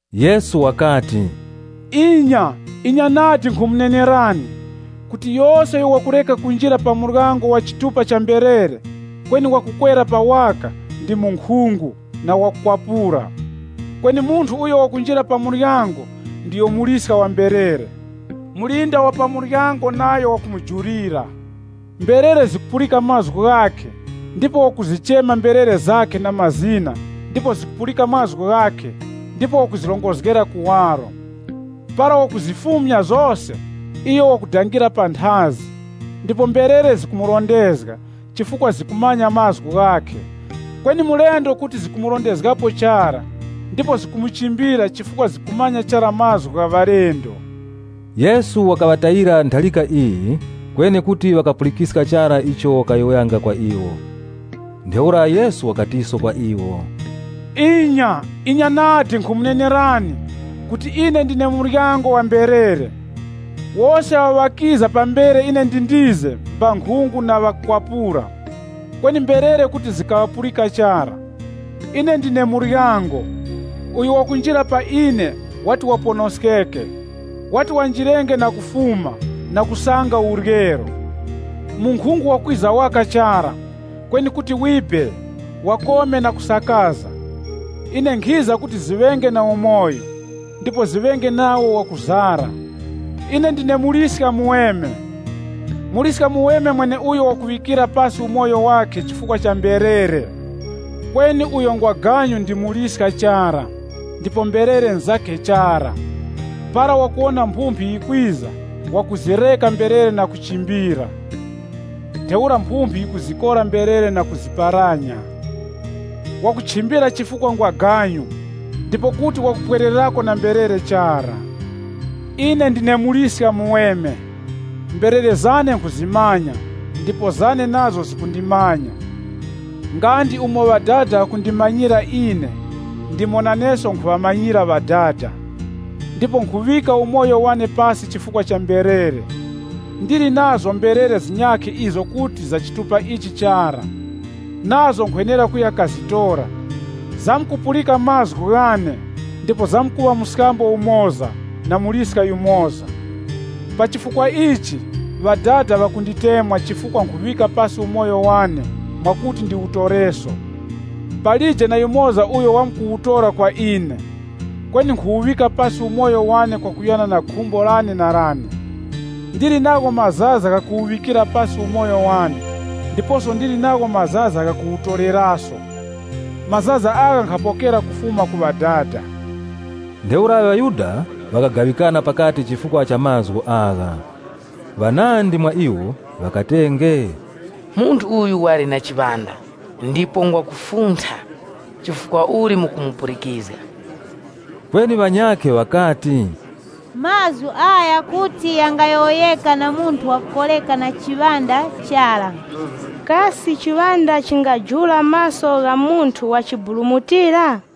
Yesu wakati, “Inya, inya nadi, nkhumunenerani, kuti yose uyo wakureka kunjira pa muryango wa chitupa cha mberere, kweni wakukwerera pa waka, ndi munkhungu, na wakukwapura. Kweni munthu uyo wakunjira pa muryango, ndiyo muliska wa mberere. Mulinda wa pa muryango nayo wakumujulira. Mberere zikupulika mazgu ghakhe ndipo wakuzichema mberere zakhe na mazina ndipo zikupulika mazgu ghakhe ndipo wakuzirongozgera kuwaro. Para wakuzifumya zose, iyo wakudangira panthazi, ndipo mberere zikumurondezga, chifukwa zikumanya mazgu ghakhe. Kweni mulendo kuti zikumurondezgapo chara, ndipo zikumuchimbira chifukwa zikumanya chara mazgu gha ŵalendo.” Yesu wakaŵatayira ntharika iyi, kweni kuti ŵakapulikiska chara icho wakayowoyanga kwa iwo. Ntheura Yesu wakatiso kwa iwo, Inya, inya nadi, nkhumunenerani kuti ine ndine muryango wa mberere. Wose awo ŵakiza pambere ine ndindize, mbankhungu na ŵakukwapura, kweni mberere kuti zikaŵapulika chara. Ine ndine muryango. Uyo wakunjira pa ine, wati waponoskeke. Wati wanjirenge na kufuma, na kusanga uryero. Munkhungu wakwiza waka chara, kweni kuti wibe, wakome na kusakaza. Ine nkhiza kuti ziŵenge na umoyo, ndipo ziŵenge nawo wakuzara. “Ine ndine Muliska muweme. Muliska muweme mweneuyo wakuŵikira pasi umoyo wakhe chifukwa cha mberere. Kweni uyo ngwaganyu ndipo ndi muliska chara, uyo mberere nzakhe chara, para wakuwona mphumphi yikwiza, wakuzireka mberere na kuchimbira. Ntheura mphumphi yikuzikora mberere na kuziparanya. Wakuchimbira chifukwa ngwaganyu, ndipo kuti wakupwererako na mberere chara. Ine ndine Muliska muweme. Mberere zane nkhuzimanya ndipo zane nazo zikundimanya, nga ndi umo Ŵadada ŵakundimanyira ine, ndipo naneso nkhumanyira Ŵadada. Ndipo nkhuŵika umoyo wane pasi chifukwa cha mberere. Ndili nazo mberere zinyakhe izo kuti za chitupa ichi chara. Nazo nkhwenera kuya kazitora. Zamkupulika mazgu ghane, ndipo zamkuŵa mskambo umoza, na muliska yumoza. “Pa chifukwa ichi, Ŵadada ŵakunditemwa chifukwa nkhuwuŵika pasi umoyo wane mwakuti ndiwutoreso. Palije na yumoza uyo wamkuwutora kwa ine, kweni nkhuwuŵika pasi umoyo wane kwakuyana na khumbo lane na lane. Ndili nagho mazaza gha kuwuŵika pasi umoyo wane ndiposo ndili nagho mazaza ghakuwutoreraso. Mazaza agha nkhapokera kufuma ku Ŵadada.” Ntheura ŵaYuda ŵakagaŵikana pakati chifukwa cha mazgu agha. Ŵanandi mwa iwo ŵakatenge, “Munthu uyu wali na chiŵanda, ndipo ngwa kufuntha. Chifukwa uli mukumupulikizga?” Kweni ŵanyakhe ŵakati, “Mazgu agha kuti ghangayowoyeka na munthu wa kukoreka na chiŵanda chara. Kasi chiŵanda chingajula maso gha munthu wachiburumutira?”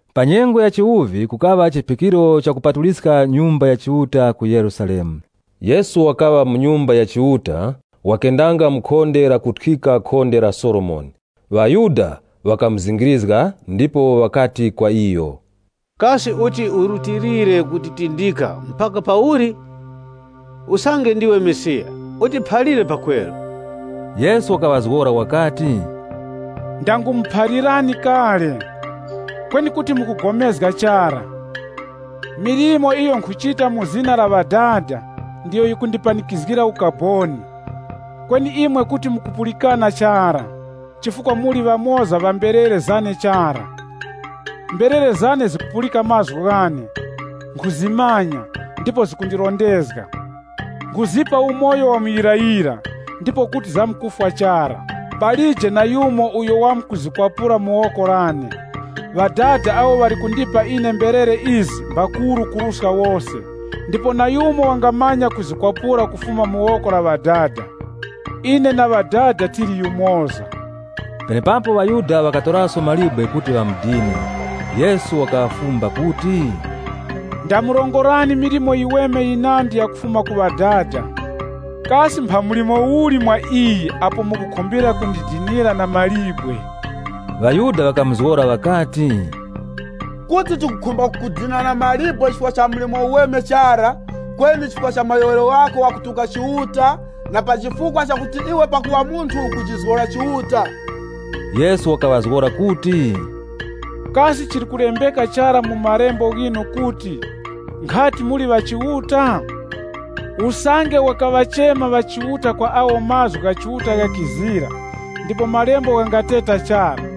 Pa nyengo ya chiwuvi kukaŵa chiphikiro cha Kupatuliskira Nyumba ya Chiuta ku Yerusalemu. Yesu wakaŵa mu Nyumba ya Chiuta wakendanga mu khonde ilo likuthyika khonde la Solomoni. ŴaYuda ŵakamuzingirizga ndipo ŵakati kwa iyo, “Kasi uti urutilire kutitindika mpaka pauli? Usange ndiwe Mesiya utiphalire pakweru.” Yesu wakaŵazgora ŵakati, “Ndangumuphalirani kale. Kweni kuti mukupulikana chara. Milimo iyo nkhuchita mu zina la Ŵadada ndiyo yikundipanikizgira ukaboni. Kweni imwe kuti mukupulikana chara, chifukwa muli ŵamoza ŵa mberere zane chara. Mberere zane zikupulika mazgu ghane, nkhuzimanya, ndipo zikundirondezga. Nkhuzipa umoyo wa muyirayira, ndipo kuti zamkufwa chara. Palije na yumoza uyo wamkuziphanga mu woko lane. Ŵadada awo ŵali kundipa ine mberere izi mbakuru kuruska wose, ndipo na yumoza wangamanya kuziphanga kufuma mu woko la Ŵadada. Ine na Ŵadada tili yumoza.” Penepapo ŵaYuda ŵakatoraso mawe kuti ŵamudine. Yesu wakaŵafumba kuti, “Ndamurongorani milimo yiweme yinandi ya kufuma ku Ŵadada. Kasi mpha mlimo uli mwa iyi apo mukukhumbira kundidinira na mawe?” ŴaYuda ŵakamuzgora ŵakati, “Kuti tikukhumba kukudina na mawe chifukwa cha mlimo uweme chara, kweni chifukwa cha mayowoyero ghako gha kutuka Chiuta, na pa chifukwa chakuti iwe pakuŵa munthu ukujizgora Chiuta.” Yesu wakaŵazgora kuti, “Kasi chili kulembeka chara mu malembo ghinu kuti, ‘Nkhati, muli ŵachiuta?’ Usange wakaŵachema ŵachiuta kwa awo mazgu gha Chiuta ghakiza ‘ndipo malembo ghangateta chara’,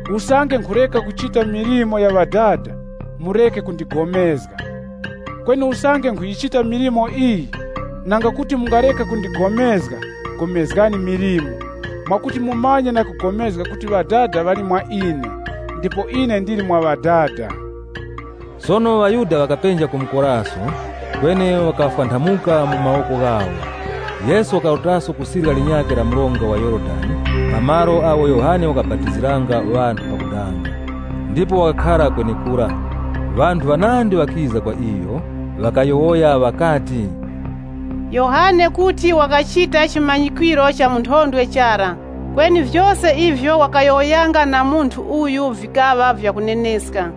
Usange nkhureka kuchita milimo ya Ŵadada, ipo mureke kupulikana nane. Kweni usange nkhuyichita milimo iyi, nanga kuti mungareka kupulikana nane, pulikanani na milimo yane, mwakuti mumanye na kupulikana kuti Ŵadada ŵali mwa ine, ndipo ine ndili mwa Ŵadada.” Sono ŵaYuda ŵakapenja kumukoraso, kweni wakafwanthamuka mu mawoko ghawo. Yesu wakarutaso ku sirya linyakhe la mronga wa Yorodani pa malo agho Yohane wakabapatiziranga ŵanthu pakudanga, ndipo wakakhara kwenekura. Ŵanthu ŵanandi ŵakiza kwa iyo, ŵakayowoya ŵakati, “Yohane kuti wakachita chimanyikwiro cha munthondwe chara, kweni vyose ivyo wakayowoyanga na munthu uyu vikaŵa vyakuneneska.”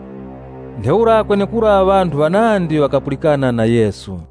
Ntheura kwenekura ŵanthu ŵanandi ŵakapulikana na Yesu.